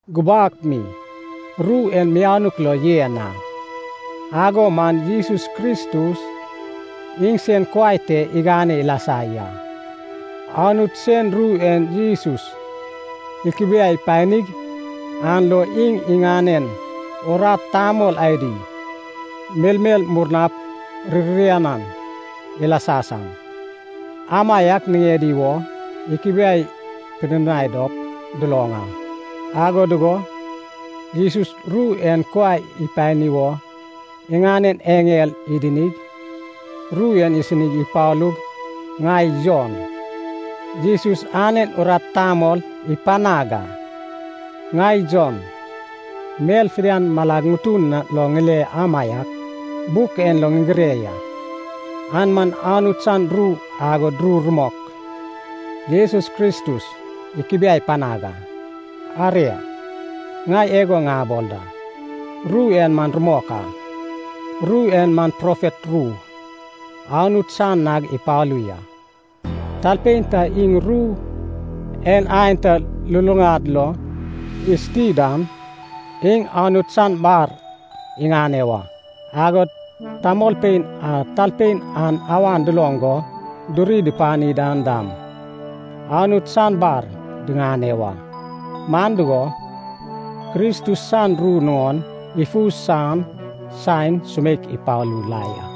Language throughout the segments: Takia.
Gubak mi ru en mianuk lo yen a. Ago man Jesus Kristus iŋsen kuai te iganeg ilasa ya. Anut sen ru en Jesus ikubiai panig an lo iŋ iŋanen urat tamol adi, melmel murnap ririanan ilasa san, amaiak niŋedi wo ikubiai pidinai dop duloŋ a. Ago dugo Jesus ru en kuai ipani wo iŋanen eŋel idinig, ru en isini ipalug ŋai Jon, Jesus anen urat tamol ipanag a. Ŋai Jon, mel fidian malag ŋutun lo ŋile amaiak, buk en lo ŋigire ya. An man Anut san ru agod ru rumok Jesus Kristus ikubiai panag a. Aria, ŋai igo ŋabol da, ru en man rumok a. Ru en man profet ru, Anut san nag ipalu ya. Talpein ta iŋ ru en aenta luluŋad lo isuti dan, iŋ Anut san bar iŋane wa. Agod tamolpein a talpein an awan duloŋ go duri dupani dan dam, Anut san bar diŋane wa. Man dugo, Kristus san ru nuŋon ifu san saen sumeik ipalu la ya.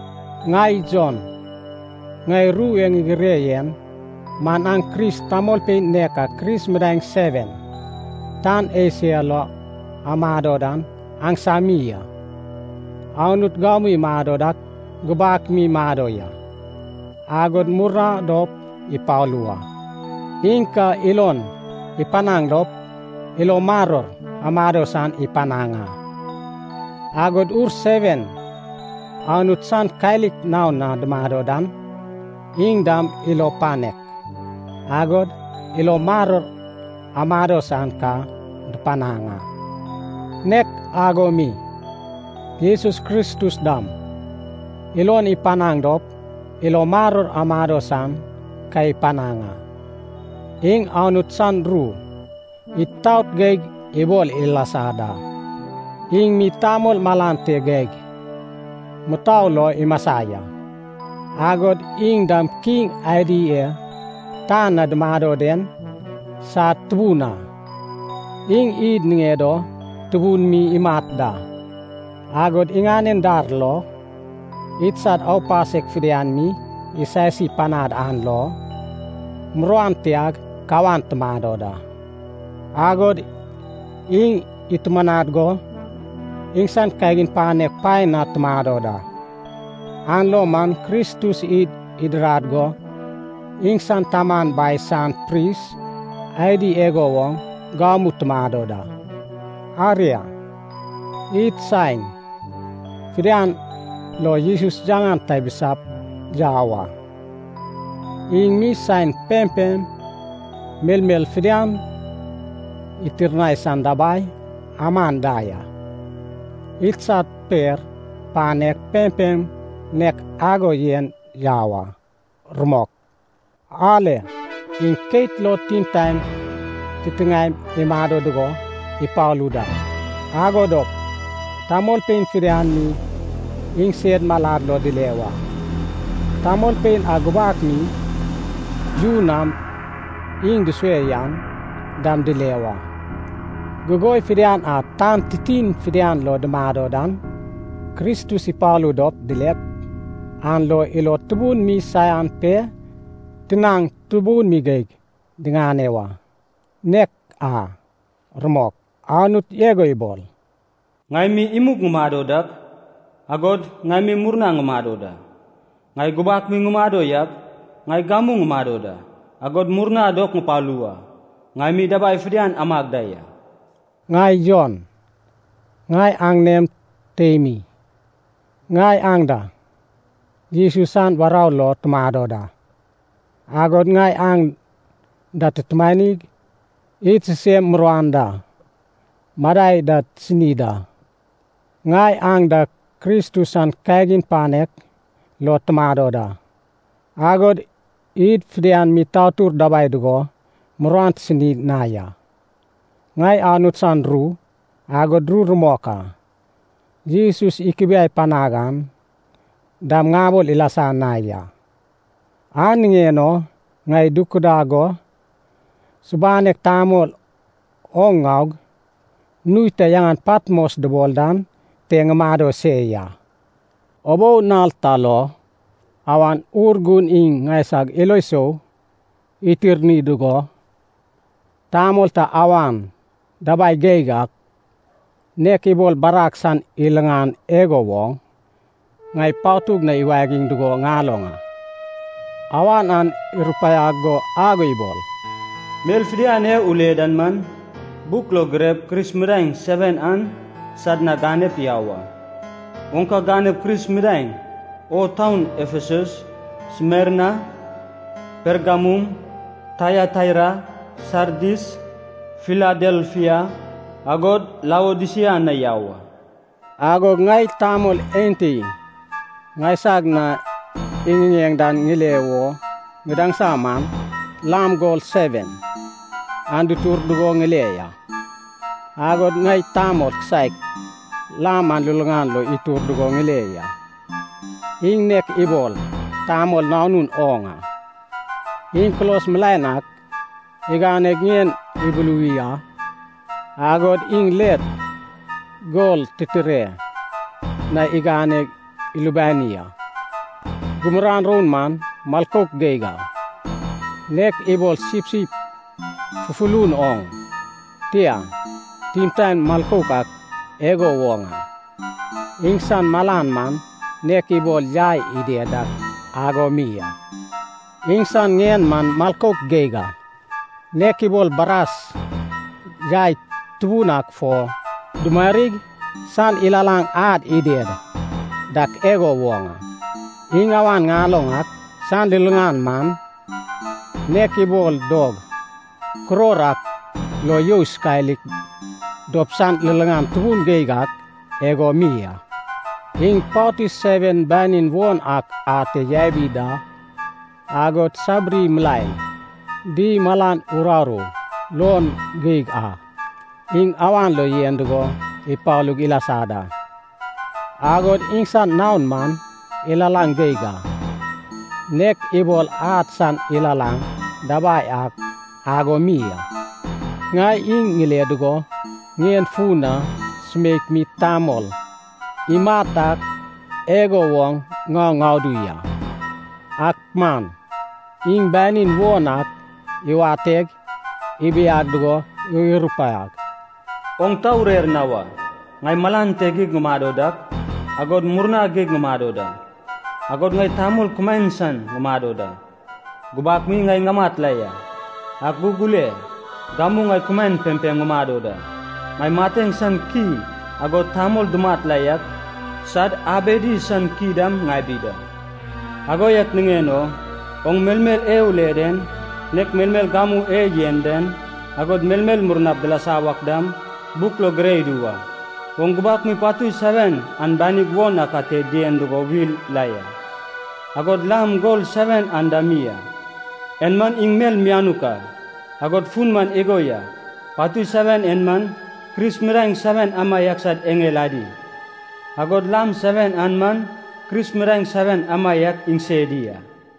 Ŋai Jon, ŋai ru e ŋigire yen man aŋ Kris tamolpein nek a Kris midaeŋ seven, tan Esia lo amado dan aŋsami a. Anut gamu imado dak, gubak mi imado ya, agod murna dop ipalu wa. Iŋ ka ilon ipanaŋ dop, ilo maror amado san ipanaŋ a. Agod ur seven Anut san kalik naon na dumado dan, iŋ dam ilo panek, agod ilo maror amado san ka dupanaŋ a. Nek ago mi, Jesus Kristus dam, ilon ipanaŋ dop ilo maror amado san ka ipanaŋ a. Iŋ Anut san ru itaot geig ibol ilasa da. Iŋ mi tamol malan te geig mutou lo imasa ya. Agod iŋ dam kiŋ adi e tan na dumado den sad Tubun a. Iŋ id niŋed o tubun mi imat da, agod iŋanen dar lo idsad aupasek fidian mi isasi panad an lo, muruan tiag kawan tumado da. Agod iŋ itumanad go iŋsan kagin panek paen na tumado da. An lo man Kristus id idirad go iŋsan Taman Bai san pris adi igo woŋ gamu tumado da. Aria, id saen fidian lo Jesus yaŋan tabisap yau a. Iŋ mi saen pempem melmel fidian itirnai san dabai aman da ya. Idsad per panek pempem nek ago yen yau a. Rumok. Ale. Iŋ keit lo timtaen titiŋaem imado dugo ipalu da! Ago dop tamolpein fidian mi iŋsed malad lo dile wa. Tamolpein a gubak mi yu nam iŋ dusue yan dam dile wa. Gugoi fidian a tan titin fidian lo dumado dan, Kristus ipalu dop dilep, an lo ilod tubun mi saian pe tinaŋ tubun mi geig digane wa. Nek a, rumok! Anut igo ibol, “Ŋai mi imug ŋumado dak, agod ŋai mi murna ŋumado da. Ŋai gubak mi ŋumado yak, ŋai gamu ŋumado da, agod murna dop ŋupalu wa. Ŋai mi dabai fidian amag da ya.” Ŋai Jon, ŋai aŋanem teimi, ŋai aŋ da Jesus san warou lo tumado da, agod ŋai aŋ da tutumanig id sisem muruan da madai da tisini da. Ŋai aŋ da Kristus san kagin panek lo tumado da, agod id fidian mi tatur dabai dugo muruan tisini na ya. Ŋai Anut san ru, agod ru rumok a Jesus ikubiai panad an dam ŋabol ilasa na ya. An niŋen o ŋai dukudag go subanek tamol oŋ ŋaug, nui ta yaŋan Patmos dubol dan te ŋumado se ya. Ubou nal ta lo, Awan Urgun iŋ ŋaisag ilo sou itirni dugo, tamol ta awan dabai geig ak, nek ibol barag san lilaŋan igo woŋ, ŋai patug na iwagiŋ dugo ŋaloŋ a. Awan an irupaiag go ago ibol, “Mel fidian e ule den man, buk lo girep, Kris midaeŋ seven an sad na ganep yau a. Oŋ ka ganep Kris midaeŋ o taun Efesus, Smerna, Pergamum, Taiataira, Sardis, Filadelfia, agod Laodisia na yau a.” Agog ŋai tamol enti ŋaisag na iŋiŋeŋ dan ŋile wo ŋadaŋsa man, lam gol seven an dutur dugo ŋeil a. Agod ŋai tamol kisaek lam an luluŋad lo itur dugo ŋile ya. Iŋ nek ibol “tamol nanun oŋ a.” Iŋ kulos milaen ak iganeg ŋien ibuluwi a, agod iŋ let gol titire na igane ilubani a. Gumuran roun man milkouk geig a, nek ibol sipsip fufulun oŋ, tia, timtaen milkouk ak igo woŋ a. Iŋsan malan man nek ibol yai ided dak ago mi a. Iŋsan ŋien man milkouk geig a, nek ibol bras yai tubun ak fo dumarig san ilalaŋ ad ided dak igo woŋ a. Iŋ awan ŋaloŋ ak san liliŋan man, nek ibol dog kuror ak lo you isokalik dop san liliŋan tubun geig ak igo mi a. Iŋ patui seven banin won ak ate yabi da. Agod sabiri milaen di malan uraru luon geig a, iŋ awan lo yen dugo ipalug ilasa da. Agod iŋsan naon man ilalaŋ geig a, nek ibol ad san ilalaŋ dabai ak ago mi a. Ŋai iŋ ŋile dugo ŋien fun na sumeik mi tamol imat ak igo woŋ ŋau ŋadu ya. Ak man iŋ banin won ak iwateg ibiag dugo irupaiag, “Oŋ ta urer na wa. Ŋai malan te geig ŋumado dak, agod murna geig ŋumado da. Agod ŋai tamol kumaen san ŋumado da. Gubak mi ŋai ŋamat la ya, ak gug ule, gamu ŋai kumaen pempem ŋumado da. Ŋai mateŋ san ki agod tamol dumat la yak sad abedi san ki dam ŋabi da. “Ago yak niŋen o oŋ melmel e ule den, nek melmel gamu e yen den, agod melmel murnap dilasa wak dam, buk lo gire idu wa. Oŋ gubak mi patui seven an banig won ak ate dien dugo wil la ya, agod lam gol seven an dam mi a. En man iŋ mel mianuk a, agod fun man igo ya: patui seven en man, Kris midaeŋ seven amaiak sad eŋel adi, agod lam seven an man Kris midaeŋ seven amaiak iŋsedi a.